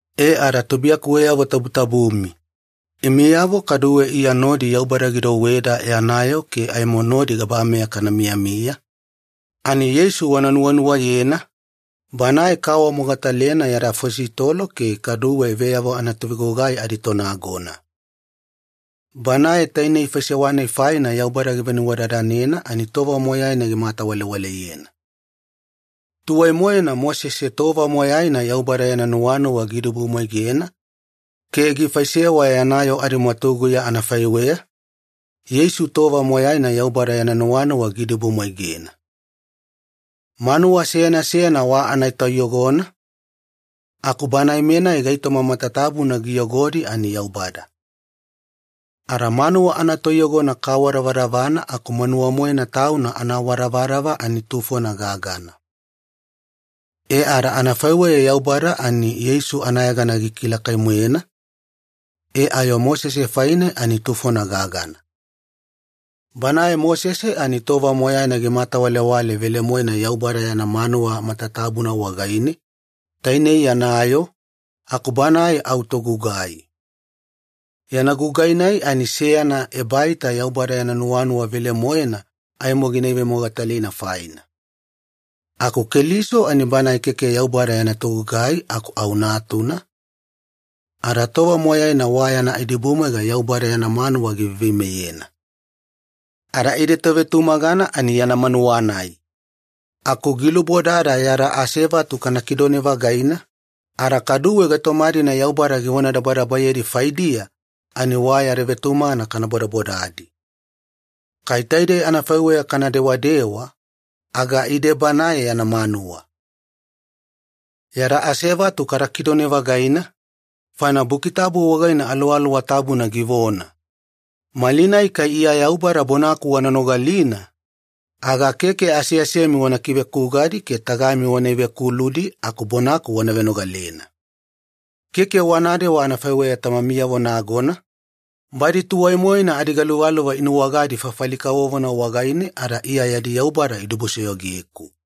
E ada tubuiyakuweyavo tabutabumi, imiyavo kaduwe Iya nodi Yaubada gidouweda yana yoo ke aimo nodi gabameya kana miyamiya, ani Yeisu wana nuwanuwayena, Banae kaawamogatalena yada afositolo ke kaduwe veyavo anatovegugai aditonagona. Banae tainei faisewa-nai faina Yaubada givenuwadadanena ani tova moyaina gimatawalewaleyena. Tuwai-moena Mosese tova moyaina Yaubada yana nuwanuwa giidibumwaigena ke gifaisewa yana yoo adimwatuguya anafaiweya, Yeisu tova moyaina Yaubada yana nuwanuwa giidibumwaigena. Manuwa seyana seyana wa anatoiyogona, aku Banae-menai gaitoma matatabuna giyogodi ani Yaubada. Ada manuwa anatoiyogona kaawadavadavana aku manuwa-moena tauna anaawadavadava ani tufona gagana. E ada anafaiweya Yaubada ani Yeisu anayegana gikilakai-moena, e ayo Mosese faine ani tufona gagana. Banae Mosese ani tova moyaina gimatawalewale velemoena Yaubada yana manuwa matatabuna wagaine, tainei yana yoo, aku banae au togugai. Yana gugai-nai ani seyana ebaita Yaubada yana nuwanuwa velemoena aimo gina ivemogatalina faina. Aku Keliso ani Banae keke Yaubada yana togugai aku au Natuna, ada tova moyaina wa yana idibudibumwaiga Yaubada yana manuwa giveiveimeyena. Ada ide tovetumagana ani yana manuwa-nai. Aku gilubodada yada asevatu kana kidone-vagaina, ada kaduwe gaitoma-dina Yaubada givonadabadabayedi faideya ani wa yada vetumagana kana bodabodadi. Kai taidei anafaiweya kana dewadewa, aga ide Banae yana manuwa. Yada asevatu kada kidone-vagaina, faina Buki Tabu wagaine Aluwaluwa Tabuna givona, “Malinai kai Iya Yaubada bonaku wana nogalina, aga keke aseasemi wana kivekugadi ke tagami wana ivekuludi, aku bonaku wana venogalena. Keke wanadewa anafaiweya tamamiyavo nagona, badi tuwai-moena adigaluvaluva inuwagadi fafali kavovona wagaine ada Iya yadi Yaubada idibusoyogeku.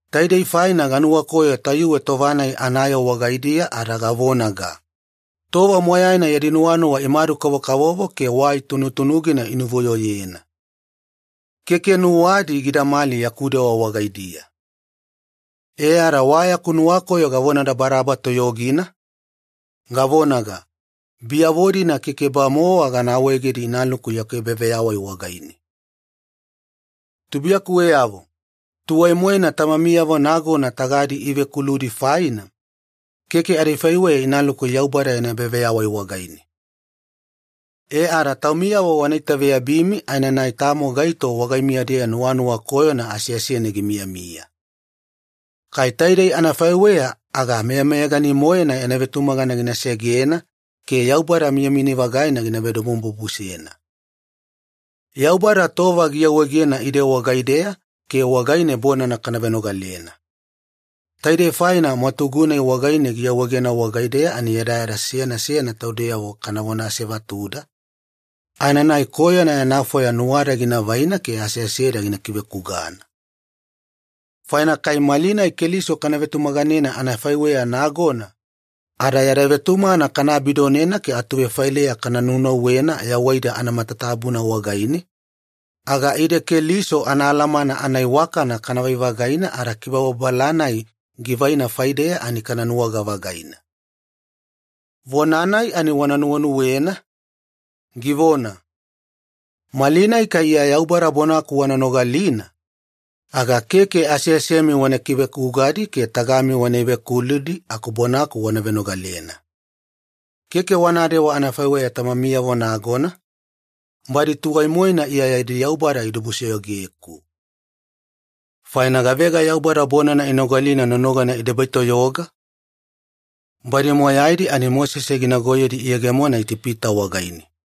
Taidei faina ganuwakoyo tayuwe tova-nai anayoo wagaidiya ada gavonaga, ‘Tova moyaina yadi nuwanuwa imadu-kavokavovo ke wai tunutunugina inuvuyoyena. Keke nuwadi gidamali yaku dewa wagaidiya.’ E ada wa yaku nuwakoyo gavonadabadaba toyogina, gavonaga, ‘Biyavo-dina keke-bamowa gana awaegedi inaluku yaku ebaveyawai wagaine.’” Tubuiyakuweyavo, tuwai-moena tamamiyavo nagona tagadi ivekuludi faina, keke adifaiweya inaluku Yaubada yana ebaveyawai wagaine. E ada taumiyavo wana itaveyabimi aenanai tamo gaito wagaimiya-deya nuwanuwa koyona aseasene gimiyamiya. Kai taidei anafaiweya, aga meyameyagani-moena yana vetumagana gina segena ke Yaubada miyamiyani-vagaina gina vedomobubusena. Yaubada tova giawaegena ide wagaideya ke wagaine bonana kana venogalena. Taidei faina mwatugu-nai wagaine giawaegena wagaideya ani yadayada seyana seyana taudeyavo kanavona asevatuda, aenanai koyona yana fwaya nuwada gina vaina ke aseaseda gina kivekugana. Faina kai malinai Keliso kana vetumaganena anafaiweya nagona, ada yada vetumagana kana abidonena ke atuvefaileya kana nunauwena yawaida anamatatabuna wagaine, aga ide Keliso anaalamana anaiwakana kanavai-vagaina ada kibababala-nai givaina faideya ani kana nuwaga-vagaina. Vona-nai ani wana nuwenuwena, givona, “Malinai kai Iya Yaubada bonaku wana nogalina, aga keke aseasemi wana kivekugadi ke tagami wana ivekuludi, aku bonaku wana venogalena. Keke wanadewa anafaiweya tamamiyavo nagona, badi tuwai-moena Iya yadi Yaubada idibusoyogeku.” Faina gavega Yaubada bonana inogalina nonogana idebaitoyoga? Badi moyaidi ani Mosese ginagoyedi iyegemona Itipita wagaine.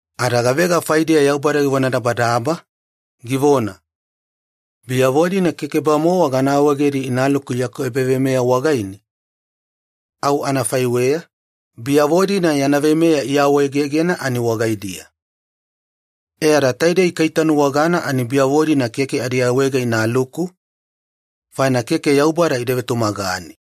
Ada gavega faidiya Yaubada givonadabadaba, givona, “Biyavo-dina keke-bamowa gana awaegedi inaluku yaku ebaveyawai wagaine”? Au anafaiweya, biyavo-dina yana veimeya iawaegegena ani wagaidiya. E ada taidei kaitanuwagana ani biyavo-dina keke adiawaega inaluku, faina keke Yaubada ida vetumagane.